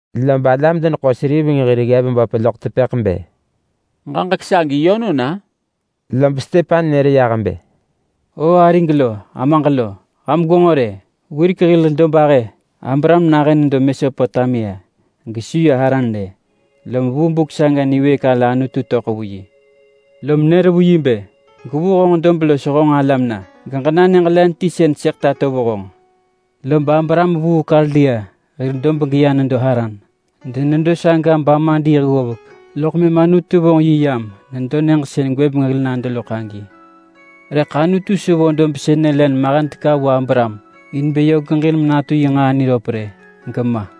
Lob alam-deneḳo-seriveng hir ggev böp loḳ tepëḳ bë, “Ġaġek sagi yönon-a?” Lob Stepan nër yah bë, “O arig lo, amaġ lo! Ham gwenġo rë! Wirek hil dobahë Abraham nahën nedo Mesopotamia gesu ya Haran rë, lob vu buk saga niwëëk ala Anutu töḳ vu yi. Lom nër vu yi bë, ‘Gwevuu honġ dob los honġ alam na geġena nyëġ len ti sën sëḳ tato vu honġ.’ Lob Abraham vuu Kaldia hir dob geya nedo Haran. Denedo saga bama diiḳ ggovek, loḳ mëm Anutu vonġ yi yam nedo nyëġ sën gwëbeng hil nado loḳ agi. Rëḳ Anutu su vo dob sënë len mahen teka vu Abraham in bë yö geġin menatu yi nġaa niröp rë, gema.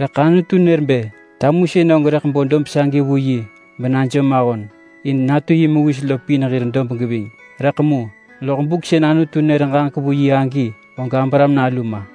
Rëḳ Anutu nër bë tamusën og rëḳ bo dob sagi vu yi benajom ahon, in natu yi mewis lo pin hir dob geving. Rëḳ mu, loḳ buk sën Anutu nër ġaġek vu yi agi, og Abraham nalu ma.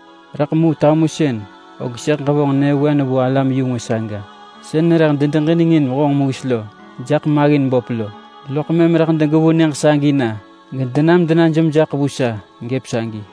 Rëḳ mu tamusën, og sëḳ ġevonġ nyëvewen vu alam-yu-ngwë saga sën rëḳ dedeġinengin honġ mewis raḳ maggin böp lo. Loḳ mëm rëḳ degevuu nyëġ sagi na, gedenam denajom jaḳ vu sa gëp sagi.’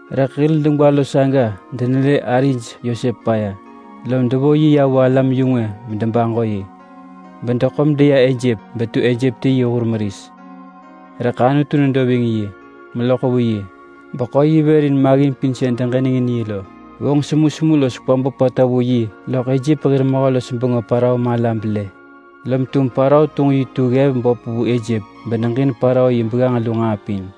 Rëḳ hil degwa lo saga denelë arij Yosep paya, lom devo yi vu alam-yu-ngwë bedebaġo yi. Bedeḳo medeya Ejep betu Ejep ti yi nġaa meris. Rëḳ Anutu nedo ving yi, meloḳ vu yi, beḳo yi vër vu nġaa nipaya pin sën deġinengin yi lo. Vonġ semusemu los kwa böpata vu yi loḳ Ejep hir mehö-los-bengö Parao mala belë. Lob tum Parao tunġ yi tu ggev yuseḳë vu Ejep beneġin Parao yi begganġ lu nġaa pin.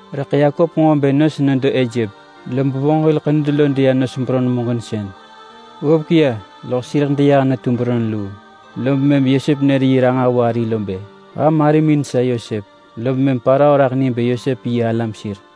Rëḳ Yakop nġo bë nos nedo Ejep, lob vonġ hil ḳenud lo deya nos beron muġinsën. Ggovek ya loḳ sireḳ deyah netu beron luu, lob mëm Yosep nër yi ranġah vu ari lo bë, ‘Ham arimin sa Yosep.’ Lob mëm Parao raḳ ni bë Yosep yi alam sir.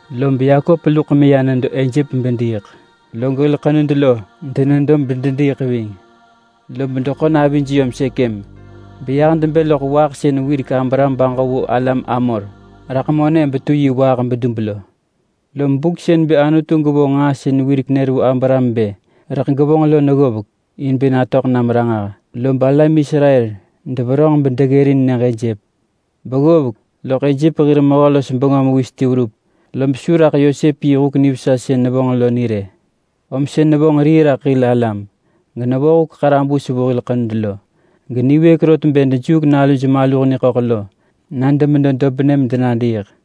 Lob Yakop luḳ meya nedo Ejep bediiḳ, log hil ḳenud lo denedo bedediiḳ ving. Lob deḳo navij yom Sekem beyah debë loḳ waaḳ sën wirek Abraham baġo vu alam Hamor raḳ monë betu yi waaḳ bedub lo. Lom buk sën bë Anutu gevonġ nġaa sën wirek nër vu Abraham bë rëḳ gevonġ lo neggovek in bë natöḳ nam ranġah, lob alam Israel deverönġ bedeggërin nyëġ Ejep. Beggovek, loḳ Ejep hir mehö-los-bengö mewis ti verup, lob su raḳ Yosep yi huk nivesa sën nevonġ lo ni rë. Om sën nevonġ rii raḳ hil alam, genevonġ huk ḳarabus vu hil ḳenud lo. Geniwëëk rot bë dejuuk naluj maluh niḳöḳ lo na demedo dobnë medenadiiḳ.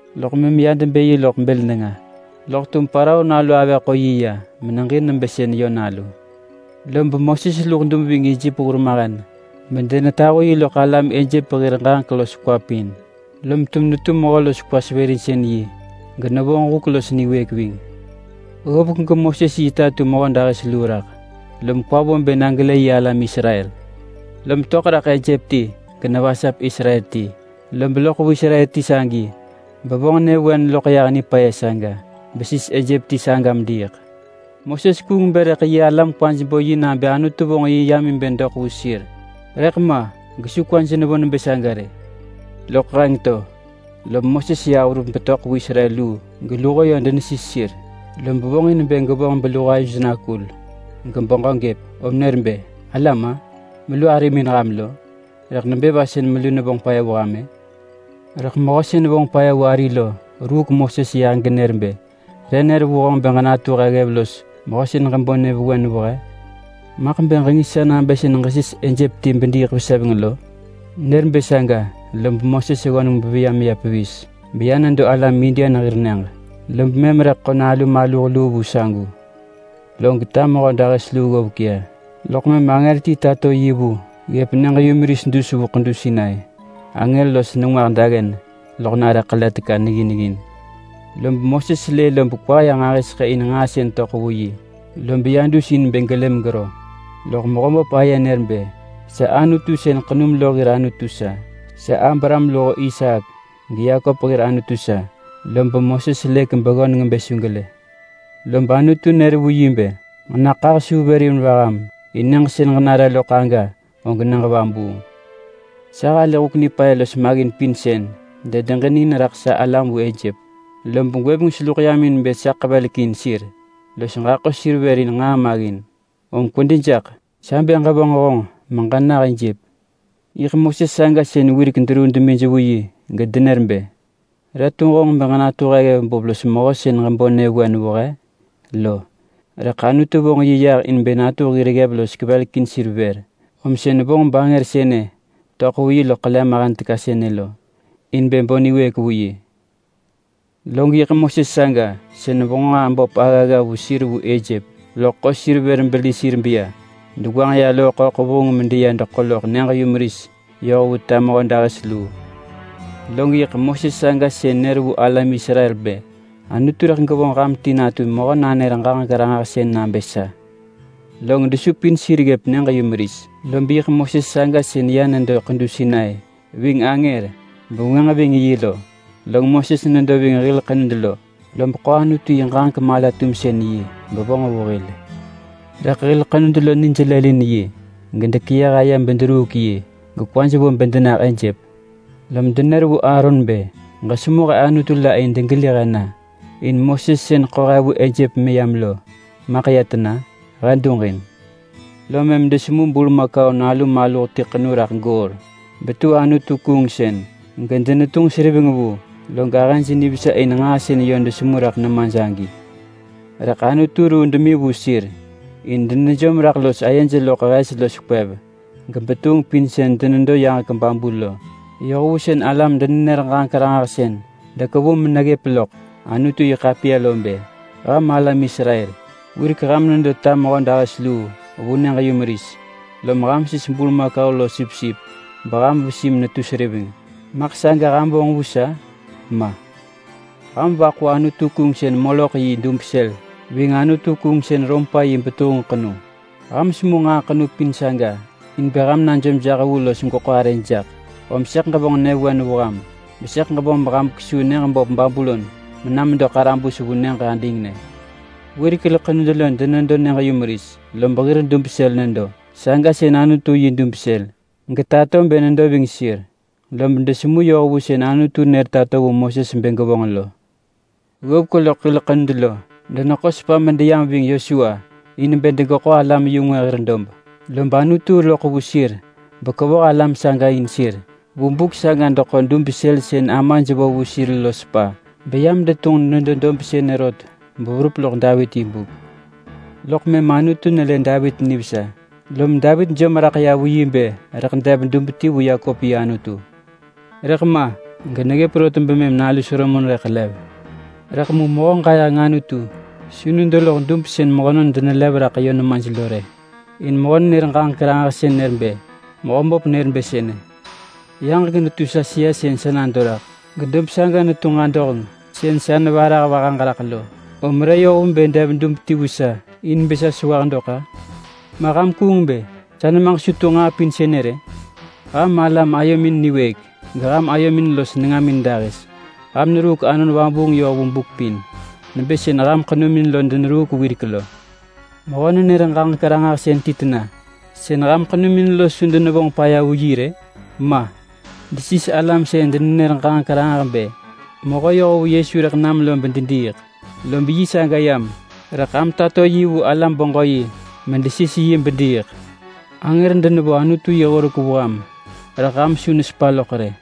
Loḳ mëm ya debë yi loḳ bël nenga, loḳ tum Parao nalu avëh ḳo yi ya meneġin nebë sën yö nalu. Lob Moses luḳ dub ving Ejep hurmahen bedenetahu yi loḳ alam Ejep hir ġaġek los kwa pin, lom tum netu mehö los kwa-sevërinsën-yi genevonġ huk los niwëëk ving. Ggovek geMoses yi ta tu mehödahis luu raḳ, lob kwa vo bë na gelë yi alam Israel. Lom töḳ raḳ Ejep ti genevasap Israel ti, lob loḳ vu Israel ti sagi bevonġ nyëvewen loḳ yah nipaya saga vu besis Ejep ti saga mediiḳ. Moses kuung bë rëḳ yi alam kwaj bo yi nabë Anutu vonġ yi yam in bë doḳ vu sir. Rëḳ ma gesu kwaj nevo nebë saga rë. Loḳ heng to lob Moses yah verup betöḳ vu Israel luu geluho denesis sir. Lob vonġin bë gevonġ beluho ayoj nakul gebeġö gëp, om nër bë, ‘Alam-a! Melu arimin ham lo! Rëḳ nebë va sën melu nevonġ paya vu ham-ë?’ Rëḳ mehö sën vonġ paya vu ari lo ruuk Moses yah genër bë, ‘Re nër vu honġ bë ġenatu he ggev los mehö sën ġebo nyëvewen vu he? Maḳ bë ġengis sa nabë sën ġesis Ejep ti bediiḳ veseveng lo?’ Nër bë saga lob Moses ggöneng beveya meya pevis. Beya nedo alam Median hir nyëġ. Lob mëm rëḳ ḳo nalu maluh luu vu sagu. Log ta mehödahis luu ggovek ya, loḳ mëm angër ti tato yi vu yi neggëp nyëġ-yumeris dus vu ḳedu Sinai. Angër los nengwah daggen loḳ nare ḳele teka niggin ggin. Lob Moses lë lob kwa ya nġahiseḳë in nġaa sën töḳ vu yi. Lob ya dus in bë gelë nivesa, lob Mehöböp aye nër bë, ‘Sa Anutu sën ḳenum lo hir Anutu sa. Sa Abraham luho Isaak geYakop hir Anutu sa.’ Lob Moses lëk beggöneng bë su gelë. Lob Anutu nër vu yi bë, ‘Ġenaḳah suu vër in vaham. In nyëġ sën ġenare loḳ aga og nyëġ vabuung. Sa halë huk nipaya los maggin pin sën dedeġinengin raḳ sa alam vu Ejep, lob gwëbeng seluḳ yam in bë sa ḳevelekin sir los ġaḳo sir vër vu nġaa maggin. Om kwedi jaḳ! Sa bë ġevonġ honġ meġenah Ejep.’ Yiḳ Moses saga sën wirek deruu demij vu yi gedenër bë, ‘Re tunġ honġ bë ġenatu ggev böp los mehö sën ġebo nyëvewen vu he?’ lo. Rëḳ Anutu vonġ yi yah in bë natu hir ggev los kevelekin sir vër, om sën vonġ bangër sënë töḳ vu yi loḳ ḳele mahen teka sën lo in bë bo niwëëk vu yi. Log yiḳ Moses saga sën vonġ nġaa böp aggagga vu sir vu Ejep, loḳ ḳo sir vër beli sir beya deyoh Loo-ḳöḳ vuheng meya deḳo loḳ nyëġ-yumeris yoh vu ta mehödahis luu. Log yiḳ Moses saga sën nër vu alam Israel bë, ‘Anutu rëḳ gevonġ ham ti natu mehö-nanër-ġaġek-ranġahsën nabë sa.’ Log desupin sir ggëp nyëġ-yumeris, lob yiḳ Moses saga sën ya nedo ḳedu Sinai ving angër bevengwënġ ving yi lo. Log Moses nedo ving hil ḳenud lo, lob ḳo Anutu yi ġaġek mala-tumsën-yi bevonġ vu hil, rëḳ hil ḳenud lo nij lëlin yi gedekeyëh aye bederuuk yi gekwaj vo bë denah Ejep. Lom denër vu Aaron bë, ‘Ġesemu he anutu la in degeli he na. In Moses sën ḳo he vu Ejep meyam lo maḳ ya tena? He duġin!’ Lom mëm desemu burmakau nalu maluh ti ḳenu raḳ goor betu anutu-kuungsën gedenetunġ seriveng vu. Log ahëj nivesa in nġaa sën yö desemu raḳ nemaj agi. Rëḳ Anutu ruu demi vu sir in denejom raḳ los ayej loḳ hes los kwev gebetuheng pin sën denedo yaġek babu lo, yoh vu sën alam-denenër-ġaġek-ranġahsën dekevu meneggëp loḳ Anutu-yi-ḳapiya lo bë: ‘Ham alam Israel, wirek ham nedo ta mehödahis luu vu nyëġ-yumeris, lom ham sis burmakau los sipsip beham vesi netu seriveng. Maḳ saga ham vonġ vu sa? Ma! Ham vaḳu anutu-kuungsën Moloḳ yi dub sël ving anutu-kuungsën Rompa yi betuheng ḳenu. Ham semu nġaa ḳenu pin saga in bë ham najom jaḳ vu los gweḳo arëj jaḳ, om sëḳ ġevonġ nyëvewen vu ham, besëḳ ġevonġ beham kwesuu nyëġ böp Babulon mena medo ḳarabus vu nyëġ adingnë.’ Wirek hil ḳenud denedo nyëġ-yumeris, lob hir dub sël nedo. Saga sën Anutu yi dub sël getato bë nedo ving sir, lob desemu yoh vu sën Anutu nër tato vu Moses bë gevonġ lo. Ggovek loḳ hil ḳenud lo deyam ving Yosua in bë degeḳo alam-yu-ngwë hir dob, lob Anutu loḳ vu sir bekevoh alam saga in sir. Vu buk saga deḳo dub sël sën amaj vo vu sir lo sepa, beyam detunġ nedo rot beverup loḳ Davit yi buk. Loḳ mëm Anutu nelë Davit nivesa, lom Davit jom raḳ vu bë rëḳ dev dub ti vu Yakop yi Anutu. Rëḳ ma geneggëp rot bemëm nalu Solomon rëḳ lev. Rëḳ mu Mehö-ġayeheng Anutu su nedo loḳ dub sën mehönon denelev raḳ yö nemaj lo rë. In mehö nenër-ġaġek-ranġahsën nër bë: ‘Mehöböp nër bë sënë: “Yaġek netu sa sëa sën sa nado raḳ, gedob saga netu nġadoheng sën sa nehebë vahaġ raḳ lo. Om re yoh vu bë dev dub ti vu sa in bë sa sewah dok-a? Ma ham kuung bë sa nemaġ su tunġ nġaa pin sënë rë?” ’ Ham alam ayomin niwëëk. Geham ayomin los nengamin dahis. Ham neruuk Anon Vabuung yoh vu buk pin nebë sën ham ḳenumin lo deneruuk wirek lo. Mehö-nenër-ġaġek-ranġahsën ti tena sën ham ḳenumin lo su denevonġ paya vu yi rë? Ma! Desis alam sën denenër ġaġek ranġah bë mehö yohvu Yesu rëḳ nam lo bedediiḳ. Lob yi saga yam, rëḳ ham tato yi vu alam-beġö-yi medesis yi bediiḳ. Angër denevo Anutu yi horek vu ham rëḳ ham su nesepa loḳ rë.”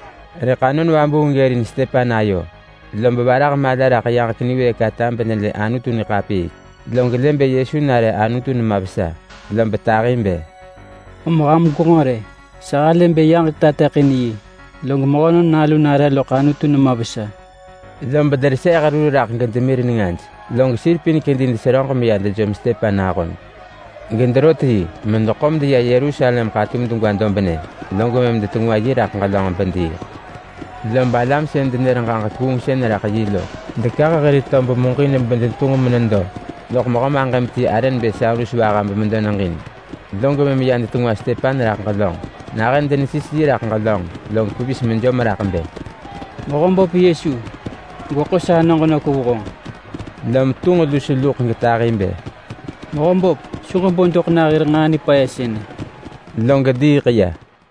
Rëḳ Anon Vabuung ggërin Stepan ayo, lob varah mala raḳ yaġek niwëëk ata benelë Anutu niḳapiik, log lë bë Yesu nare Anutu nema vesa. Lob tahi bë, “Om ham gwenġo rë! Sa halë bë yaġek tateḳin yi, log Mehönon Nalu nare loḳ Anutu nema vesa!” Lob dereseeh rur raḳ gedemir nengaj, log sir pin kedi deseröġ meya dejom Stepan ahon, gederot yi medeḳo medeya Yerusalem ḳatum degwa dobnë, log mëm detengwa yi raḳ ġelönġ bediiḳ. Lob alam sën denër ġaġek kuungsën raḳ yi lo dekah hir tob muġin bedetunġ menedo loḳ mehö maġëm ti arë nebë Saulus vaha bemedo neġin, log mëm ya detengwa Stepan raḳ ġelönġ. Nahën denesis yi raḳ ġelönġ, log pevis mejom raḳ bë, “Mehöböp Yesu! Gweḳo sanoġ nök vu honġ!” Lom tunġ lus luḳ getahi bë, “Mehöböp, su ġebo doḳ nah hir nġaa nipaya sënë!” Log diiḳ ya.